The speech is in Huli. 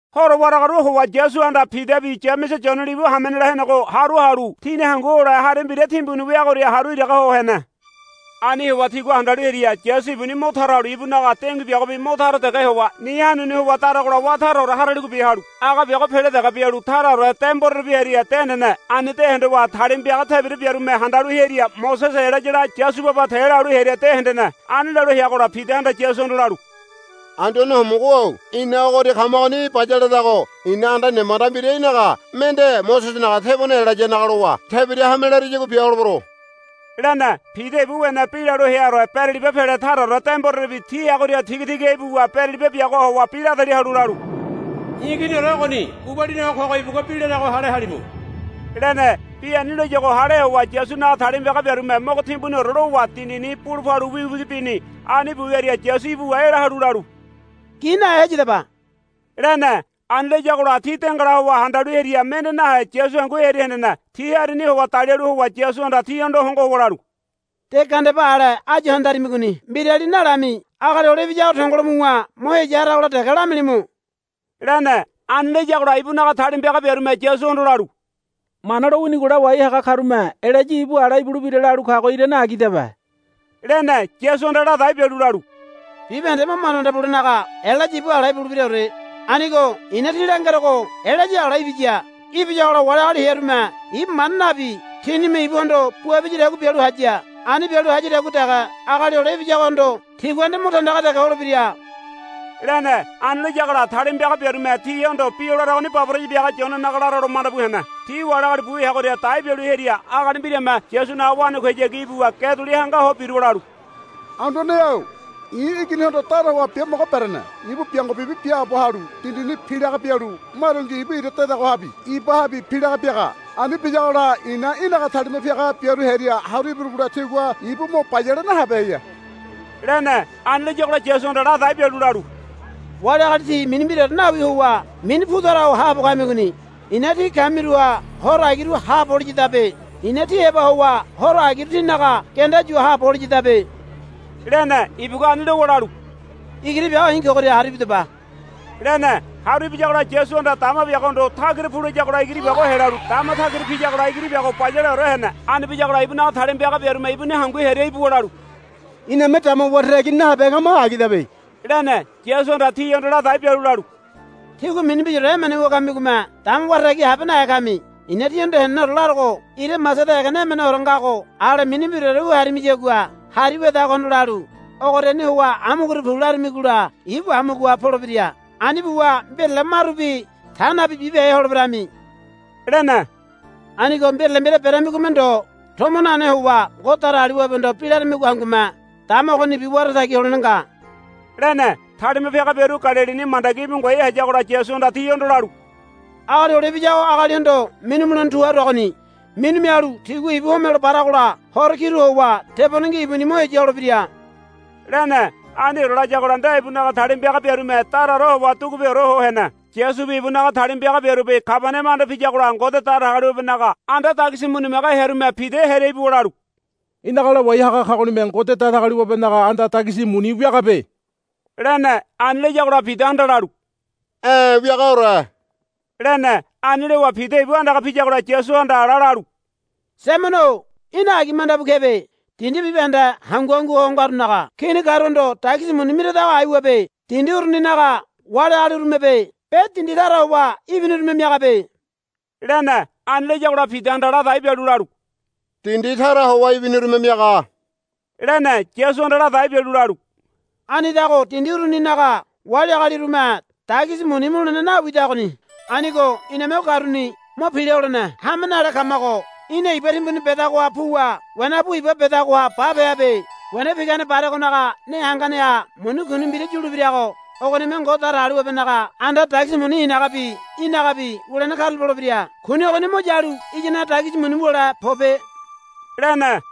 Horo waragaru howa Yasuhanda Pidabi Yamese Yone libu hamenela henego haru halu tini hangu hole hari mbira timbuni weagoria haru iraga ho hene. Ani howa tigua handalu hearia Yasu ibuni mo tara halu ibunaga dengui biago mo tara dege howa ni hanuni howa daragola wá taraore haraligobi halu aga biago pele dege bialu taraore demborerebi hearia de hendene. Ani de hondowa talima piaga tebira biarume handalu hearia Mosese Elayala Yasu baba te lalu hearia de hendene. Ani lalu heagola Pidahanda Yasuhondo lalu, Anduane Homogo-o ina ogoria kamagoni bayaledago i̱na anda nemanda mbira í̠naga mende Mosesenaga tebone Elayanaga lowa tebira hame lareyagua bia holebero, lene. Pida ibu wene bi lalu heaore beraliba pele taraore demborerebi ti heagoria tiga tiga ibuwa beraliba biagoha howa bi la dali halu lalu, I̱ Iginiore ogoni gubalini ho kogo ibugua bi larago hale halimu, lene. Bi ani layuago hale howa Yasunaga talima piaga biarume mogo timbuniore lowa dindini bulu palu wigi wigi bini. Ani bu wiaria Yasu ibuwa ela halu lalu, Gi nahe heyadaba, lene. Ani layagola ti dengala howa handalu hearia mende nahe Yasu hangu hearia hendene. Ti harini howa dalialu howa Yasuhanda tihondo hongo howa lalu, De gandeba ale áyu handarimigoni mbirali nalami Agali Hole Ibiyago tongolo muwa mo heya haragola dege lamilimu, lene. Ani layagola ibunaga talima piaga biarume Yasuhondo lalu, Mana lo winigo lawai haga karume Elaya ibu ala ibulebira lalu kago irane agidabe, lene. Yasuhanda ladai bialu lalu, Bibahende mo manda manda bulenaga Elaya ibu ala ibulebiraore. Anigo i̱na tí langerogo Elaya ala ibiya. Ibiyagola wali agali hearume ibu manda nabi tinime ibuhondo bua biyadagua bialu haya. Ani bialu hayadagua dege Agali Hole Ibiyagohondo tigua nde mo tandaga dege holebira, lene. Ani layagola talima piaga biarume tihondo bi o laragoni baboraya biaga Yonenaga laralo manda bu hene. Ti wali agali bu heagoria dai bialu hearia agali mbirame Yasunaga wanakuihayagi ibuwa ge duli hanga ho biruwa lalu, Anduane-o i̱ iginihondo dara howa biamogo berene. Ibu biango bibi biaabo halu dindini pilaga bialu marungi ibu ira dedagohabi ibahabi pilaga biaga. Ani biyagola i̱na í̠naga talima piaga biaru hearia haru ibirugola tigua ibu mo bayale nahabeheya, lene. Ani layagola Yasuhanda ladai bialu lalu, Wali agali tí mini mbiraore nawi howa mini pu tara ho haabo kamigoni. I̱na tí kamiruha horo agiru haabo holiyadabe. I̱na tí heba howa horo agiru tínaga genda yu haabo holiyadabe, lene. Ibugua ani lowa lalu, Igiri biago i̱ kogoria haru ibidaba, lene. Haru ibiyagola Yasuhanda dama biagohondo, Tagira pu, layagola igiri biago helalu dama tagira piyagola igiri biago bayaleore hene. Ani biyagola ibunaga talima piaga biarume ibuni hangu hearia ibuwa lalu, Iname dama wara tagi nahabehe kamago agidabe, lene. Yasuhanda tihondo ladai bialu lalu, Tígua mini mbiraore emene wu kamigome dama wara tagi nahabehe kami. I̱na tíhondo heneneore larogo ira masada egene emeneore ngago ale mini mbiraore wu harimiyagua hari wedagohondo lalu, Ogoriani howa amugoria pu, laramigola ibu amugoha polebira. Ani buwa mbirale marubi ta nabi bibehe holeberami, lene. [ Anigo mbirale mbira beramigome ndo tomo nane howa Ngode Datagaliwabehondo bi laramigo hangume dama ogonibi wara tagi holene nga, lene.] Talima piaga biaru Galilini mandagi íbu ngoai hayagola Yasuhanda tihondo lalu, Agali Hole Ibiyago agalihondo minu mulene tu haruagoni. Minu mialu tigua ibu homelo baragola horo kiru howa tebonengi ibuni mo heya holebira, lene. Aniore layagola nde ibunaga talima piaga biarume daraore howa dugupeore ho hene. Yasubi ibunaga talima piaga biarubi Kabaniama anda piyagola Ngode Datagaliwabenaga anda dagisi muni miaga hearume Pida hearia ibuwa lalu, Í̠naga lawai haga kagonime Ngode Datagaliwabenaga anda dagisi muni wiagabe, lene. Ani layagola Pidahanda lalu, E̱ wiagaore, lene. Ani lowa Pida ibu andaga piyagola Yasuhanda ala lalu, Saimono-o í̠na agi manda bu kebe. Dindi bibahende hangu hangu ho ngarunaga kini karuhondo dagisi muni miradago aiwabe. Dindi uruninaga wali agalirumebe be dindi tara howa ibinirume miagabe, lene. Ani layagola Pidahanda ladai bialu lalu, Dindi tara howa ibinirume miaga, lene. Yasuhanda ladai bialu lalu, Anidago dindi uruninaga wali agalirume dagisi muni mulene nawidagoni. Anigo iname o karuni mo pila holene hame nale kamago í̠na iba timbuni bedagoha puwa wena pu iba bedagoha bape habe. Wena pinagane baregonaga ne hanganeha muni kuni mbira yulebirago ogonime Ngode Datagaliwabenaga anda dagisi muni i̱nagabi í̠nagabi wulene karula polebira. Kuni ogoni mo yalu iyanaga dagisi muni wule pobe, lene.